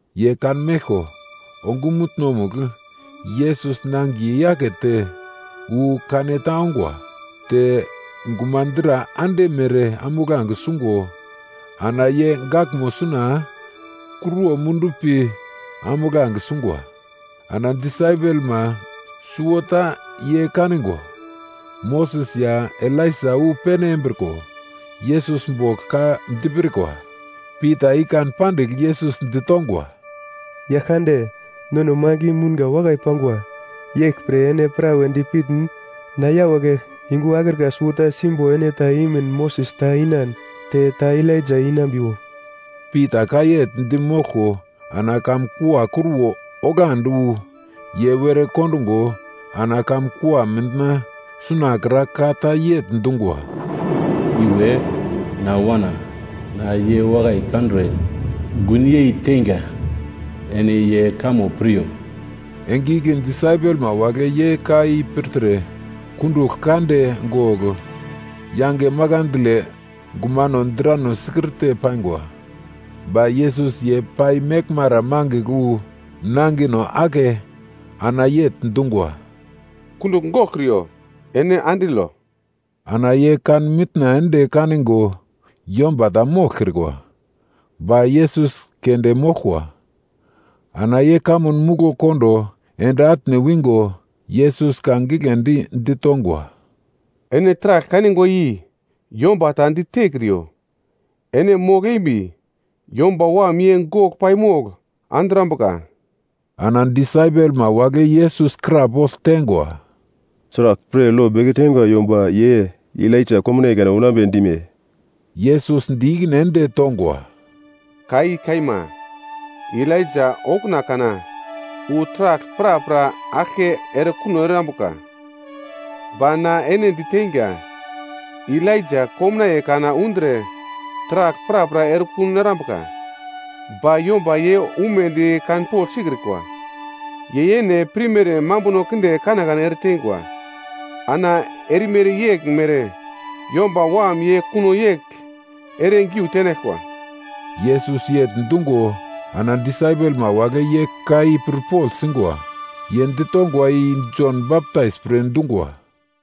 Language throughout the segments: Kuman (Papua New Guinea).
Ye kanmeglko ongumutno-mugl Yesus nangiye yakete wu kaneta ongwa. Te gumadra ande mere ambuglange sungo ana ye gaglmo suna kruwo mundu pi ambuglange sungwa. Ana disaipelma suwota ye kaningo, Moses ya Elaija wu pene embriko Yesus bogl ka dipirkwa. Pita i kan pandigl Yesus ditongwa, “Yaglkande, nono magl i mounga wakai pangwa. Yeglpre ene prawe dipitn na yawagle yungu akrika suwota simbo ene ta imin, Moses ta inan, te ta Elaija inambiwo.” Pita ka yegl di moglko ana kamun kua kruwo oglandi wu ye were kondungo, ana kamun kua mitna sunakra ka ta yegl dungwa, “Iwe na Wana, na ye wakai kandre gun yeiteinga. Ene ye kamo piryo!” Enge igle disaipelma wagle ye ka i pirtre, kundugl kande gogl yange makandle gumano drano sikirte paingwa. Ba Yesus ye pai meglmara mangigl wu nangino ake ana yegl dungwa, “Kundugl goglkriyo. Ene andilo.” Ana ye kan mitna ende kaningo yomba ta moglkrikwa, ba Yesus keunde moglkwa. Ana ye kamun muglo kondo ende atne wingo Yesus ka giglendi ditongwa, “Ene taragl kanigwa i yomba ta ditekriyo, ene mogl-embi Yomba Wam ye gogl paimogl andrambuka.” Ana disaipelma wagle Yesus krapogl teingwa, “Sraglpre lo beke teingwa yomba ye Elaija komnaiye kana unambe dime?” Yesus di ikine ende tongwa, “Ka i kaima, Elaija okuna kana wu taragl prapra aglke erekuno erambuka. Ba na ene diteinga, Elaija komnaiye kana undre taragl prapra erekun erambuka, ba yomba ye umedi kanpogl sikrikwa. Ye yene pirmere mambuno kinde kanekane ereteingwa. Ana erimere yeglmere Yomba Wam ye kuno yegl ere giu tenaglkwa.” Yesus yegl dungo ana disaipelma wagle ye ka i pirpogl singwa. Ye ditongwa i Jon Baptais pre dungwa.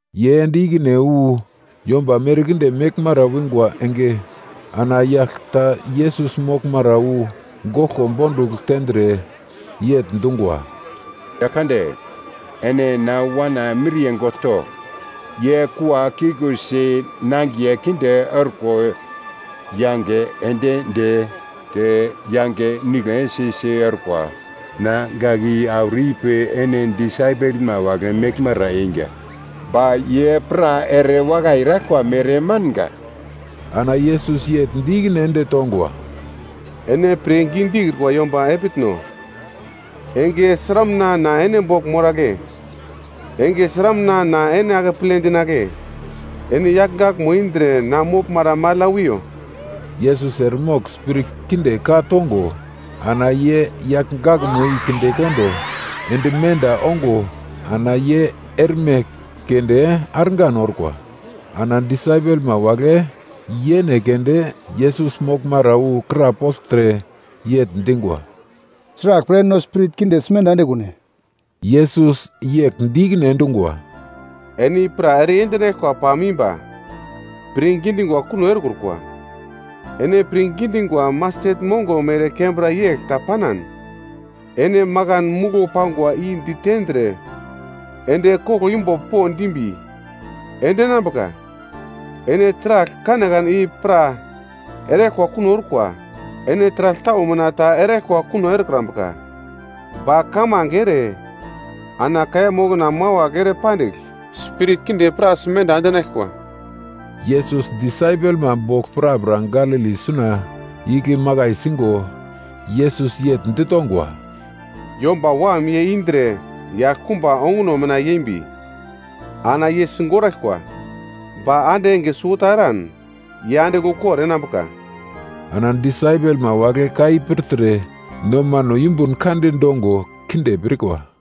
Ye ende ikine wu yomba merkinde meglmara wingwa enge, ana yagl ta Yesus moglmara wu goglko bondugl tendre, yegl dungwa, “Yaglkande, ene na wana miriye gogl to. Ye kua kikusi nangiye kinde orko yange endi de, te yange nigle si-si orkwa. Na gak i auro ipi ene disaipelma wagle meglmara einga, ba ye pra erewakai eraglkwa mere manga.” Ana Yesus yegl di ikine ende tongwa, “Ene pirngi dikrikwa yomba epitno. Enge sramuna na ene bogl moragle? Enge sramuna na ene akeple dinagle? Ene yagl gakmo i indre na moglmara magl ya wiyo.” Yesus eremogl spirit kinde ka-tongo ana ye yagl gakmo i kindekondo ende menda ongo ana ye erme keunde argan orkwa. Ana disaipelma wagle yene keunde Yesus moglmara wu krapoglte yegl dingwa, “Sraglpre no spirit kinde simenda endekune?” Yesus yegl di ikine endungwa, “Ene i pra ere yendinaglkwa pam imba, pirngi dingwa kuno erekrukwa. Ene pirngi dingwa mastet mongo mere kembra yegl ta panan, ene makan muglo pangwa i ditendre ende koglo imbo po dimbi, ende enambuka. Ene taragl kanekane i pra eraglkwa kuno orkwa. Ene taragl tau mina ta eraglkwa kuno erekrambuka, ba kamange ere ana kaiya mokona mawagl ere pandigl spirit kinde pra simenda endinaglkwa.” Yesus disaipelma bogl prapra Galili suna igle makai singo Yesus yegl ditongwa, “Yomba Wam ye indre yaglkumba onguno mina yeimbi, ana ye sigoraglkwa. Ba ande enge suwota eran ye andigl ukor enambuka.” Ana disaipelma wagle ka i pirtre nomano yumbun kande dongo kinde pirkwa.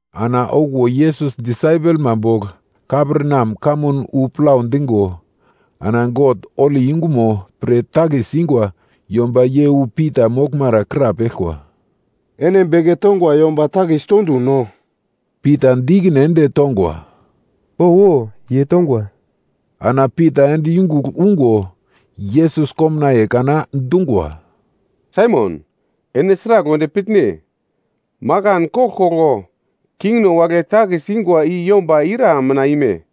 Ana okuwo Yesus disaipelma bogl Kaperneam kamun wu plau dingo, ana God holi yungumo pre takis ingwa yomba ye wu Pita moglmara krapeglkwa, “Ene beke tongwa yomba takis toduno?” Pita di ikine ende tongwa, “Owo, ye tongwa.” Ana Pita ende yungugl ungo. Yesus komnaiye kana dungwa, “Saimon, ene sragl wedi pitne? Makan koglkoglo kingno wagle takis ingwa i yomba ira mina ime?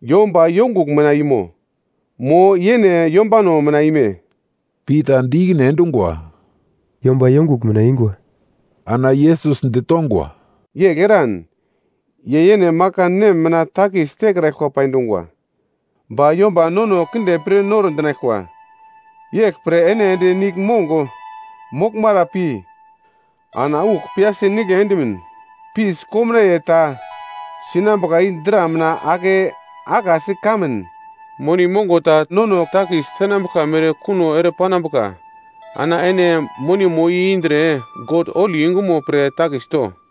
Yomba yongugl mina imo? Mo yene yombano mina ime?” Pita di ikine endungwa, “Yomba yongugl mina ingwa.” Ana Yesus ditongwa, “Yegl eran, ye yene makan nem mina takis tekraglkwa pai dungwa. Ba yomba nono kinde pir noro dinaglkwa. Yeglpre ene ende niglmong moglmara pi ana uk piyasi nigle endimin fis komnaiye ta sinambuka i dra mina ake akasi kanmin, moni mongo ta nono takis tenambuglka mere kuno ere panambuka. Ana ene monimo i indre God holi yungumo pre takis to.”